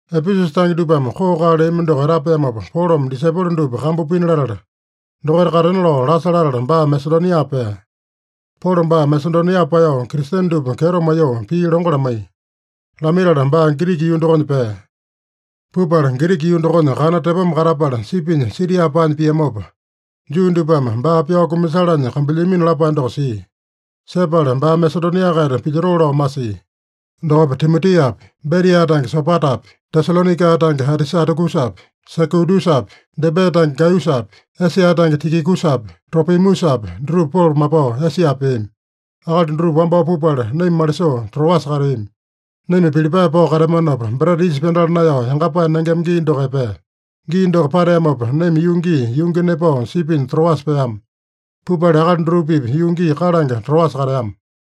Epesusa tange dupame koo-kaa leami doko etapeamopa, Polome disaipolo dupa kambu pina latala, dokaita katena lao lasa latala, baa Masedonia pea. Polo baa Masedonia paeyao, Kristene dupa kyeto maiyoo pii longo lamaiya. Lamaitala baa Giriki yuu dokonya pea. Pupala Giriki yuu dokonya kana tepoma katapala, sipinya Siria paanya piamopa, Juu dupame baa pyao kumasalanya kambuilyamino lapae doko sia. Sepala baa Masedonia-kaita pilyotoo lao masia. Dokopa Timotiapi, Beria tange Sopatapi, Tesalonaika tange Atisatakusapi, Sekundusapi, Debe tange Gaiyusapi, Esia tange Tikikusapi, Tropimusapi dutupa Polo mapao Esia peami. Akali dutupa wambao pupala, naima malisoo Troasa kateami. Naima Pilipae pao kateamanopa, Breta Yisa Pyandala Naeyao Yangapae Nengema gii doko epea. Gii doko pateamopa, naima yuu gii yungi nepao sipinya Troasa peama. Pupala akali dutupa-pipa yuu gii kalange Troasa kateama.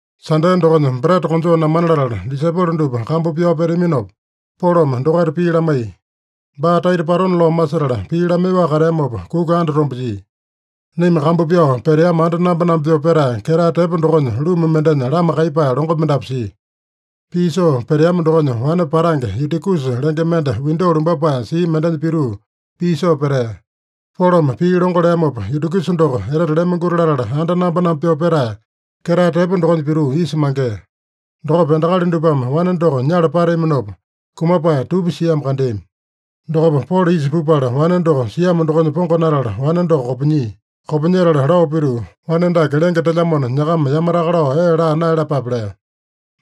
Sande dokonya breta konjoo namana latala, disaipolo dupa kambu pyao peteaminopa, Polome dokaita pii lamaiya. Baa taita patona lao masetala pii lamaiyoaka kateamopa, kuka andatombe jia. Naima kambu pyao peteama anda namba-namba pyoo petae, ketae tepo dokonya ruma mendenya lama kaiyepae longo mendapu sia. Pii soo peteama dokonya wane patange Yutikusa lenge mende windo lumbapae sia mendenya pituu pii soo petea. Polome pii longo leamopa, Yutikusa doko etete lemonguti latala anda namba-namba pyoo petae, ketae tepo dokonya pituu isa mangea. Dokopa endakali dupame wane doko nyala pateaminopa, kumapae tupi siamo kandeami. Dokopa Polo isa pupala wane doko siamo dokonya pongonatala, wane doko kopinyia. Kopinyetala lao pituu, “Wane dake lenge telyamona, nyakama yamataka lao ee laa naeyalapape” lea.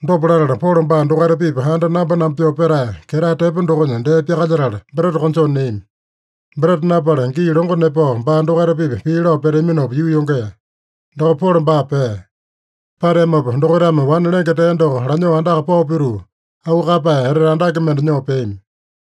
Dopa latala, Polo baa dokaita-pipa anda namba-namba pyoo petae, ketae tepo dokonya dee pyakalyetala, breta konjoo neami. Breta napala, gii longo nepao baa dokaita-pipa pii lao peteaminopa, yuu yongea. Dokopa Polo baa pea. Pateamopa dokaitame wane lenge tea doko lanyoo andaka pao pituu, auu kaeyapae etete andake mende nyoo peami.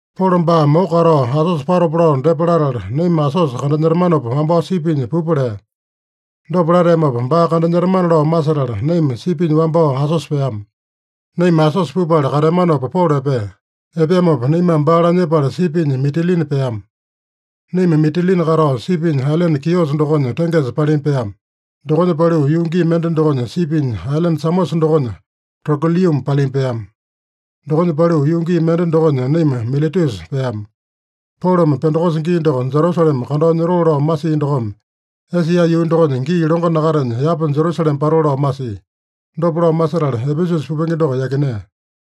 Polo baa moko katao Asosa patopa lao depa latala, naima Asosa kandanyetamanopa wambao sipinya pupa lea. Dopa lateamopa, baa kandanyetamana lao masetala, naima sipinya wambao Asosa peama. Naima Asosa pupala kateamanopa, Polo epea. Epeamopa naimame baa lanyepala sipinya Mitilini peama. Naima Mitilini katao, sipinya ailene Kiosa dokonya tengesa palima peama. Dokonya paliu yuu gii mende dokonya, sipinya ailene Samosa dokonya Trogiliuma palima peama. Dokonya paliu yuu gii mende dokonya naima Miletusa peama. Polome Pendekosa gii doko Jerusalema kandao nyotoo lao masia dokome, Esia yuu dokonya gii longo nakatenya, yapa Jerusalema patoo lao masia. Dopa lao masetala Epesusa pupenge doko yakinea.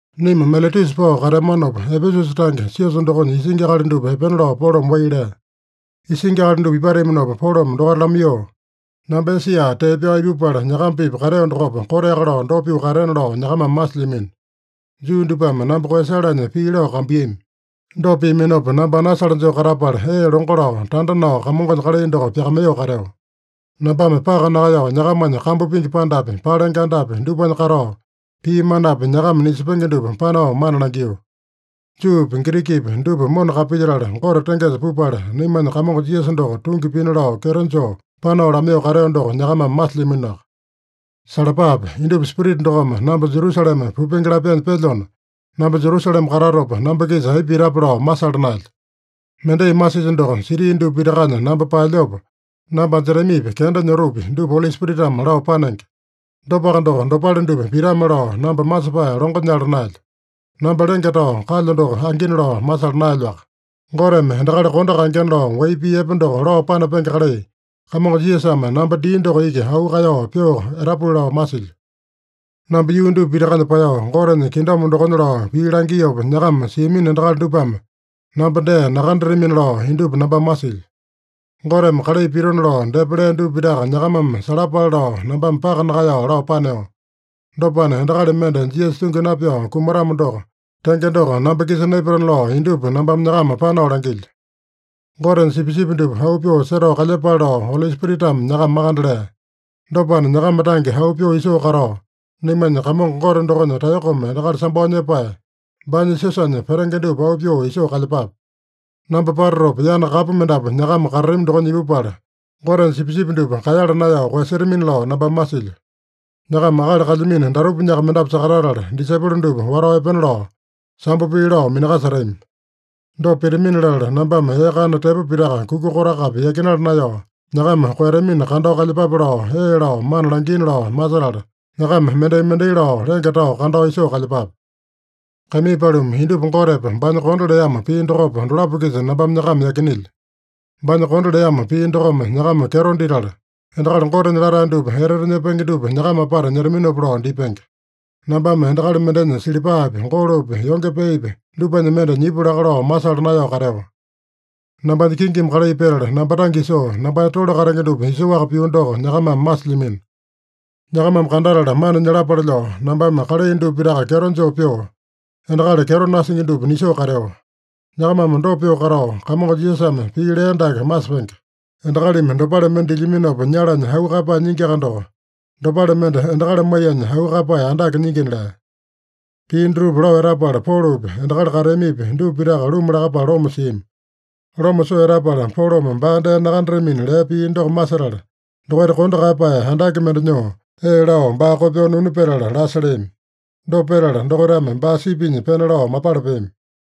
Naima Miletusa pao kateamanopa, Epesusa tange siosa dokonya isingi akali dupa epena lao Polome wai lea. Isingi akali dupa ipateaminopa Polome dokaita lamaiyoo, “Namba Esia tee pyao ipupala nyakama-pipa kateo dokopa, koteaka lao dopa pyoo kateena lao nyakamame masilyamino. Juu dupame namba koeyasalanya pii lao kambuiyami. Dopa piaminopa, namba anasale joo katapala, ee longo lao, tanda nao, Kamongonya kalai doko pyakamaiyoo kateo. Nambame paka nakaeyao, nyakamanya kambu pingi pandapi, palenge andapi, dupanya katao, pii manapi nyakama nisepenge dupa panao mana langio. Juupi, Girikipi dupa mona kapilyetala, Gote tengesa pupala, naimanya Kamongo Jisasa doko tungi pina lao kyeto joo panao lamaiyoo kateo doko nyakamame masilyaminoaka. Salapape! Indupa Spirita dokome namba Jerusalema pupenge lapyanya pelyona, namba Jerusalema katatopa namba-kisa aipa pitape lao masala naelyo. Mendai masilyo doko, siti dupa pitakanya namba paelyopa, namba anjetamipi, kenda nyotopi, dupa Oli Spiritame lao panenge. Dopaka doko, dopale dupa pitame-lao namba masepae longo nyala naelyo. Namba lenge tao kalyo doko angina lao masala naelyoaka. Goteme endakali kondo kaengena lao wai pii epe doko lao panapenge kalai, Kamongo Jisasame namba dia doko iki auu kaeyao pyoo etapuli lao masilyo. “Namba yuu dupa pitakanya paeyao, Gotenya kingdom dokonya lao pii langiopa nyakama siamino endakali dupame namba dee nakandatamina lao indupa nambame masilyo. Goteme kalai pitona lao depa lea dupa pitaka nyakamame salapale lao, nambame paka nakaeyao lao paneo. Dopana, endakali mende Jisasa tungi napyao kumatamo doko, tenge doko namba-kisa naipatana lao indupa nambame nyakama panao langilyo. Gotenya sipisipi dupa auu pyoo setao kalyepale lao, Oli Spiritame nyakama makande lea. Dopana, nyakama tange auu pyoo isoo katao, naimanya Kamongo Gote dokonya taeyokome endakali sambao nyepae, baanya siosanya petenge dupa auu pyoo isoo kalyepape. Namba patatopa, yana kapu mendapu nyakama katatami dokonya ipupala, Gotenya sipisipi dupa kaeyala naeyao koeyasetamina lao nambame masilyo. Nyakama akali kalyamino datupanyaka mendapu sakatatala, disaipolo dupa watao epena lao sambo pii lao minakasetami. Dopa pitamini-latala, nambame ee kana tepo pitaka kuka kotakapi yakinala naeyao, nyakama koeyatamina kandao kalyepape lao, ee lao mana langiina lao masetala, nyakama mendai-mendai lao lenge tao kandao isoo kalyepape. Kaimii paluma, indupa Gotepa, baanya kondo leamo pii dokopa, dolapo-kisa nambame nyakama yakinelyo. Baanya kondo leamo pii dokome nyakama kyeto ditala, endakali Gotenya latae dupa etete nyepenge dupa nyakama apata nyetaminopa lao dipenge. Nambame endakali mendenya silipapi, golopi, yonge peepi, dupanya mende nyipu laka lao masala naeyao kateo. Nambanya kingimi kalai petala, namba tange isoo, nambanya tole katenge dupa isoaka pio doko nyakamame masilyamino. Nyakamame kandatala mana nyalapale lao, nambame kalai dupa pitaka kyeto joo pyoo, endakali kyeto nasingi dupa nisoo kateo. Nyakamame dopa pyoo katao, Kamongo Jisasame pii lea dake masepenge: ‘Endakalimi dopale mende dilyaminopa nyalanya auu kaeyapae nyingiaka doko, dopale mende endakali maiyanya auu kaeyapae andake nyingina’” lea. Pii dutupa lao etapala, Polopi, endakali kateamipi, dupa pitaka luma lakapala loma siami. Loma soo etapala, Polome baa dee nakandatamina lea pii doko masetala, dokaita kondo kaeyapae andake mende nyoo, ee lao baa kopyoo nunu petala lasa leami. Dopa petala dokaitame baa sipinya pena lao mapala peami.